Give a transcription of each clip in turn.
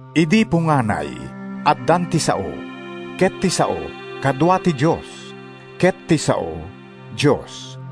Idi punganay, addan ti Sao, ket ti Sao kadua ti Dios, ket ti Sao, Dios.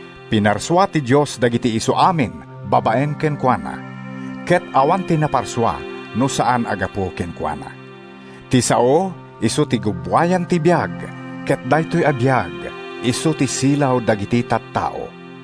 Pinarsua ti Dios dagiti isuamin babaen kenkuana. Ket awan ti naparsua no saan a gapu kenkuana. Ti Sao isu ti gubbuayan ti biag, ket daytoy a biag isu ti silaw dagiti tattao.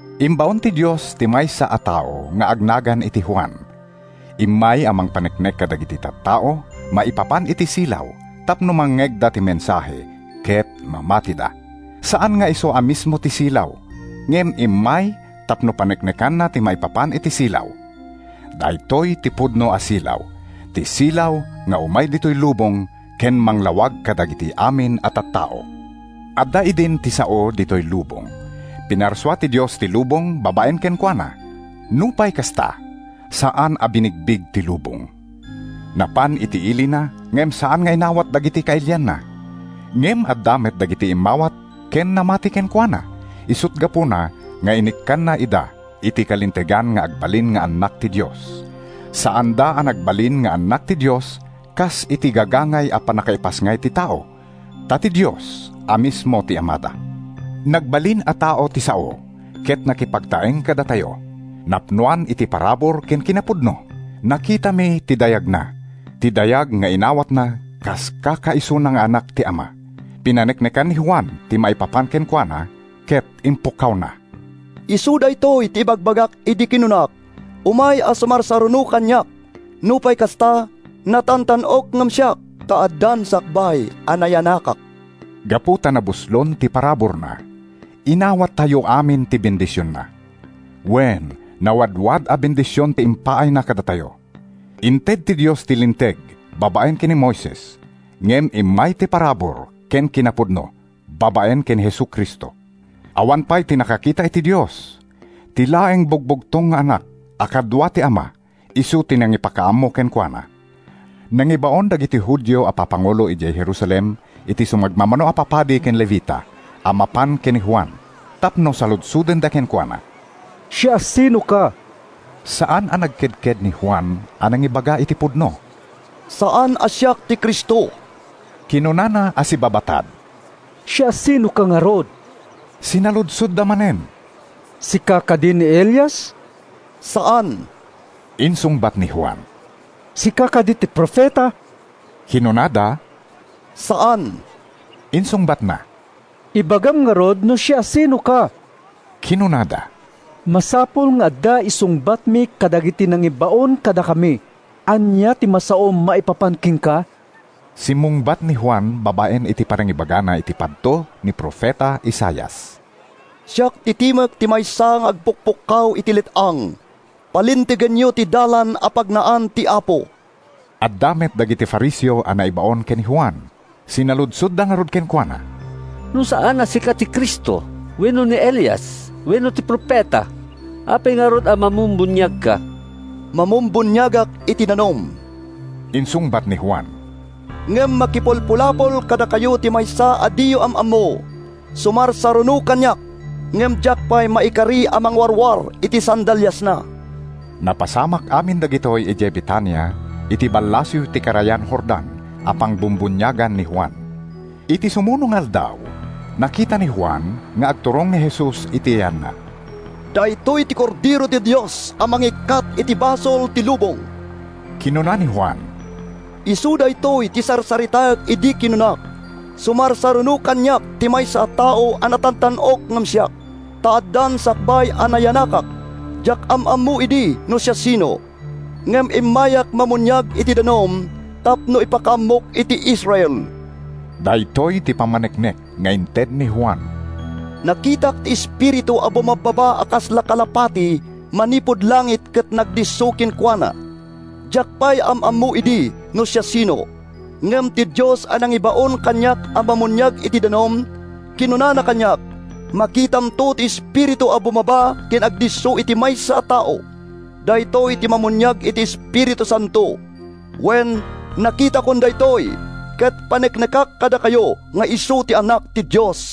Imbaon ti Dios ti maysa a tao nga agnagan iti Juan. Immay a mangpaneknek kadagiti tattao maipapan iti silaw tapno mangngegda ti mensahe ket mamatida. Saan nga isu a mismo ti silaw, ngem immay tapno paneknekanna ti maipapan iti silaw. Daytoy ti pudno a silaw, ti silaw nga umay ditoy lubong ken manglawag kadagiti amin a tattao. Adda idin ti Sao ditoy lubong. Pinarsua ti Dios ti lubong babaen kenkuana; nupay kasta, saan a binigbig ti lubong. Napan iti ilina, ngem saan nga inawat dagiti kailianna. Ngem adda met dagiti immawat ken namati kenkuana, isut’ gapuna nga inikkanna ida iti kalintegan nga agbalin nga annak ti Dios. Saanda a nagbalin nga annak ti Dios kas iti gagangay a pannakaipasngay ti tao; ta ti Dios a mismo ti Amada. Nagbalin a tao ti Sao ket nakipagtaeng kadatayo; napnoan iti parabur ken kinapudno. Nakitami ti dayagna, ti dayag nga inawatna kas kakaisuna nga Anak ti Ama. Pinaneknekan ni Juan ti maipapan kenkuana ket impukkawna: “Isu daytoy ti ibagbagak idi kinunak, ‘Umay a sumarsaruno kaniak, nupay kasta, natantan-ok ngem siak, ta addan sakbay a nayanakak.’” Gapu ta nabuslon ti paraburna, inawattayo amin ti bendisionna. Wen, nawadwad a bendision ti impaayna kadatayo. Inted ti Dios ti Linteg babaen ken ni Moises, ngem immay ti parabur ken kinapudno babaen ken Jesu-Cristo. Awan pay ti nakakita iti Dios. Ti laeng Bugbugtong nga Anak, a kadua ti Ama, isu ti nangipakaammo kenkuana. Nangibaon dagiti Judio a papangulo idiay Jerusalem iti sumagmamano a papadi ken Levita a mapan ken ni Juan tapno saludsodenda kenkuana, “Siasinoka?” Saan a nagkedked ni Juan a nangibaga iti pudno, “Saan a siak ti Cristo,” kinunana a sibabatad. “Siasinoka ngarud?” sinaludsodda manen. “Sika kadi ni Elias?” “Saan,” insungbat ni Juan. “Sika kadi ti Profeta?” kinunada. “Saan,” insungbatna. “Ibagam ngarud no siasinoka,” kinunada. “Masapul nga adda isungbatmi kadagiti nangibaon kadakami. Ania ti masaom maipapan kenka?” Simmungbat ni Juan babaen iti panangibagana iti padto ni profeta Isaias: “Siak ti timek ti maysa nga agpukpukkaw iti let-ang: ‘Palintegenyo ti dalan a pagnaan ti Apo!’” Adda met dagiti Fariseo a naibaon ken ni Juan. Sinaludsodda ngarud kenkuana, “No saan a sika ti Cristo, wenno ni Elias, wenno ti Profeta, apay ngarud a mamumbuniagka?” “Mamumbuniagak iti danum,” insungbat ni Juan, “ngem makipulpulapol kadakayo ti maysa a diyo am-ammo. Sumarsaruno kaniak, ngem diak pay maikari a mangwarwar iti sandaliasna.” Napasamak amin dagitoy idiay Betania, iti ballasiw ti karayan Jordan a pangbumbuniagan ni Juan. Iti sumuno nga aldaw, nakita ni Juan nga agturong ni Jesus iti yanna. “Daytoy ti Kordero ti Dios a mangikkat iti basol ti lubong!” kinuna ni Juan. “Isu daytoy ti sarsaritaek idi kinunak, ‘Sumarsaruno kaniak ti maysa a tao a natantan-ok ngem siak, ta addan sakbay a nayanakak.’ Diak am-ammo idi no siasino, ngem immayak mamuniag iti danum tapno ipakaammok iti Israel.” Daytoy ti pammaneknek nga inted ni Juan: “Nakitak ti Espiritu a bumabbaba a kasla kalapati manipud langit ket nagdisso kenkuana. Diak pay am-ammo idi no siasino, ngem ti Dios a nangibaon kaniak a mamuniag iti danum, kinunana kaniak, ‘Makitamto ti Espiritu a bumaba ken agdisso iti maysa a tao. Daytoy ti mamuniag iti Espiritu Santo.’ Wen, nakitakon daytoy, ket paneknekak kadakayo nga isu ti Anak ti Dios.”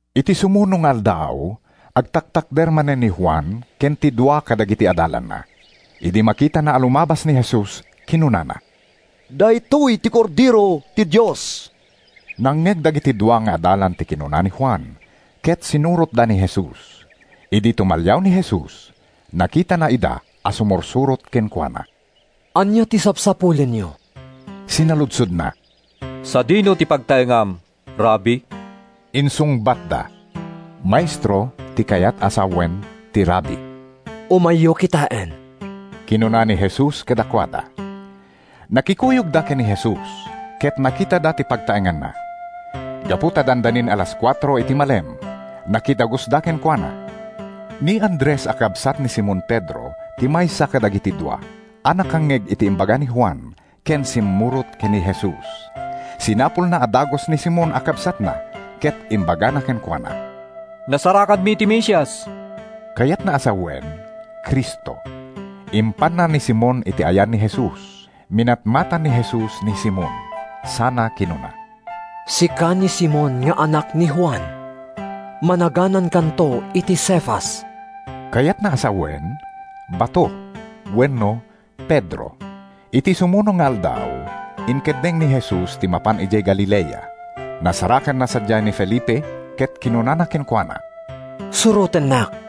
Iti sumuno nga aldaw, agtaktakder manen ni Juan ken ti dua kadagiti adalanna. Idi makitana a lumabas ni Jesus, kinunana, “Daytoy ti Kordero ti Dios!” Nangngeg dagiti dua nga adalan ti kinuna ni Juan, ket sinurotda ni Jesus. Idi tumalliaw ni Jesus, nakitana ida a sumursurot kenkuana. “Ania ti sapsapulenyo?” sinaludsodna. “Sadino ti pagtaengam, Rabbi?” insungbatda. (“Maestro” ti kayat a sawen ti “Rabbi.”) “Umayyo kitaen,” kinuna ni Jesus kadakuada. Nakikuyogda ken ni Jesus ket nakitada ti pagtaenganna. Gapu ta dandanin alas kuatro iti malem, nakidagusda kenkuana. Ni Andres a kabsat ni Simon Pedro ti maysa kadagiti dua a nakangngeg iti imbaga ni Juan ken simmurot ken ni Jesus. Sinapulna a dagus ni Simon a kabsatna ket imbagana kenkuana, “Nasarakanmi ti Mesias!” (Kayatna a sawen, “Cristo.”) Impanna ni Simon iti ayan ni Jesus. Minatmatan ni Jesus ni Simon sana kinuna, “Sika ni Simon nga anak ni Juan. Managanankanto iti Cefas.” (Kayatna a sawen, “Bato” wenno “Pedro.”) Iti sumuno nga aldaw, inkeddeng ni Jesus ti mapan idiay Galilea. Nasarakanna sadiay ni Felipe ket kinunana kenkuana, “Surotennak.”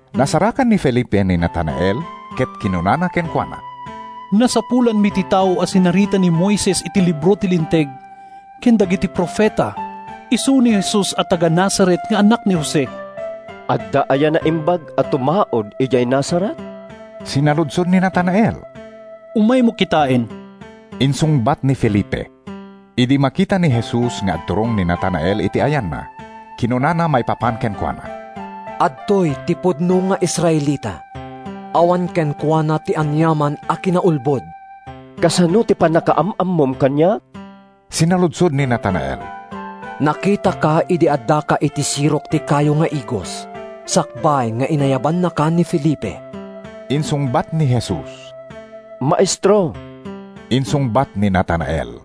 Nasarakan ni Felipe ni Natanael ket kinunana kenkuana, “Nasapulanmi ti tao a sinarita ni Moises iti libro ti Linteg, ken dagiti Profeta. Isu ni Jesus a taga-Nazaret nga anak ni Jose.” “Adda aya naimbag a tumaud idiay Nazaret?” sinaludsod ni Natanael. “Umaymo kitaen,” insungbat ni Felipe. Idi makita ni Jesus nga agturong ni Natanael iti ayanna, kinunana maipapan kenkuana, “Adtoy ti pudno nga Israelita. Awan kenkuana ti aniaman a kinaulbod.” “Kasano ti pannakaam-ammom kaniak?” sinaludsod ni Natanael. “Nakitaka idi addaka iti sirok ti kayo nga igos, sakbay nga inayabannaka ni Felipe,” insungbat ni Jesus. “Maestro,” insungbat ni Natanael.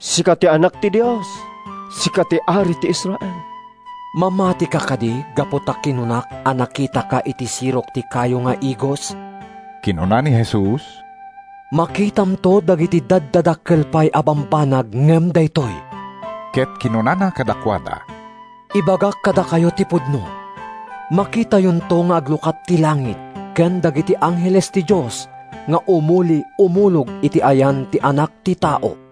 “Sika ti Anak ti Dios! Sika ti Ari ti Israel!” “Mamatika kadi gapu ta kinunak a nakitaka iti sirok ti kayo nga igos?” kinuna ni Jesus. “Makitamto dagiti daddadakkel pay a bambanag ngem daytoy!” Ket kinunana kadakuada, “Ibagak kadakayo ti pudno: makitayonto nga aglukat ti langit ken dagiti angheles ti Dios nga umuli-umulog iti ayan ti Anak ti Tao.”